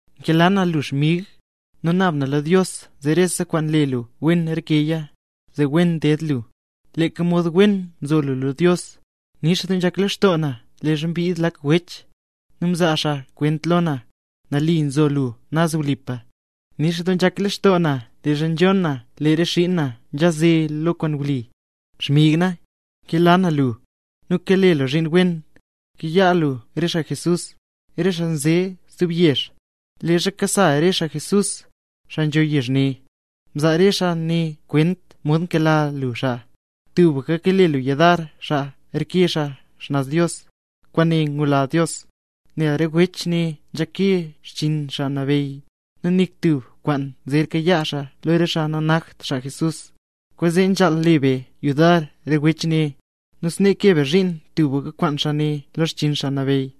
Nkela na lu xmig, nu naab na lo Dios zee rese kwaan le lu wen rekeya, zee wen ded lu, leeka mod wen nzo lu lo Dios. Nix doo nzhak lextoo na leezha mbid lak wech, nu mzaa xaa kwent lo na, nali nzo lu naz wlipa. Nix doo nzhak lextoo na leezha nzhon na lee re xiin na nkanze lo kwaan wli. Xmig na, nkela na lu. Lu kale tub zhiin wen, kayaa lu re xaa Jesús, re xaa nze stub yezh. Leezha nkasa re xaa Jesús, xaa nzho yezh ne, mzaa re xaa ne kwent xomod mkela lu xaa. Tubka kale lu yudar xaa reke xaa xnaz Dios, kwaane nyula Dios. Nel re wech ne nzha nkee xchiin Xaa Nabeyy, nu nik tub kwaan zer kayaa xaa lo re xaa nanakt xaa Jesús. Kwaanzee nzhaal le be yudar re wech ne. Nu snee kee be zhiin tubka kwaan xaa ne lo xchiin Xaa Nabeyy.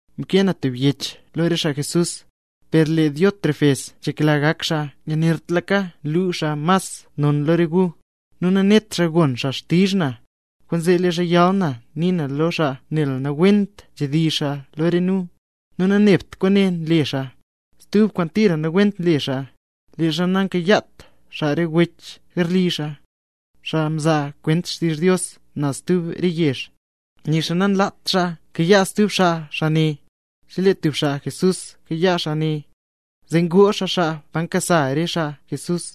Mkee na tub yech lo re xaa Jesús, per lee Diótrefes nzhekla gak xaa yanertlaka nu xaa mas non lo re gu, nu nanet xaa gon xaa xtizh na. Kwaanzee leezha yal na nii na lo xaa nel nawent nzhedizh xaa lo re nu. Nu nanebt kwaane nle xaa, stub kwaan tira nawent nle xaa, leezha nankayaat xaa re wech garli xaa, xaa nzaa kwent xtizh Dios naz stub re yezh. Nixa nanlaat xaa kayaa stub xaa xaa ne. Chelee tub xaa Jesús nkayaa xaa ne, zee ngoo xaa xaa pa nkasa re xaa Jesús.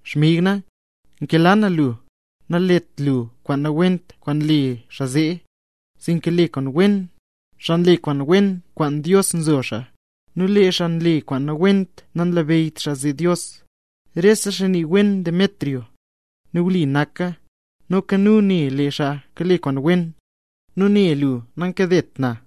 Xmig na, nkela na lu. Nalet lu kwaan nawent kwaan nle xaa zee, sinka le kwaan wen. Xaa nle kwaan wen, kwaan Dios nzo xaa, nu lee xaa nle kwaan nawent nanlabeyyt xaa zee Dios. Rese xaa nii wen Demetrio, nu wli naka. Noka nu ne lee xaa kale kwaan wen, nu ne lu nankadet na.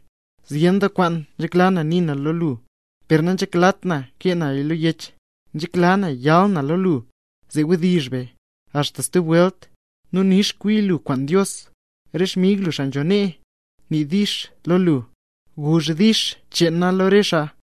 Zyen doo kwaan nzhekla na nii na lo lu, per nanzheklat na kee naya lo yech. Nzhekla na yal na lo lu, zee wdizh be. Axta stub welt, nu nix kwi lu kwaan Dios. Re xmig lu xaa nzho nee, nii “dix” lo lu. Guzh “dix” cheen nu lo re xaa.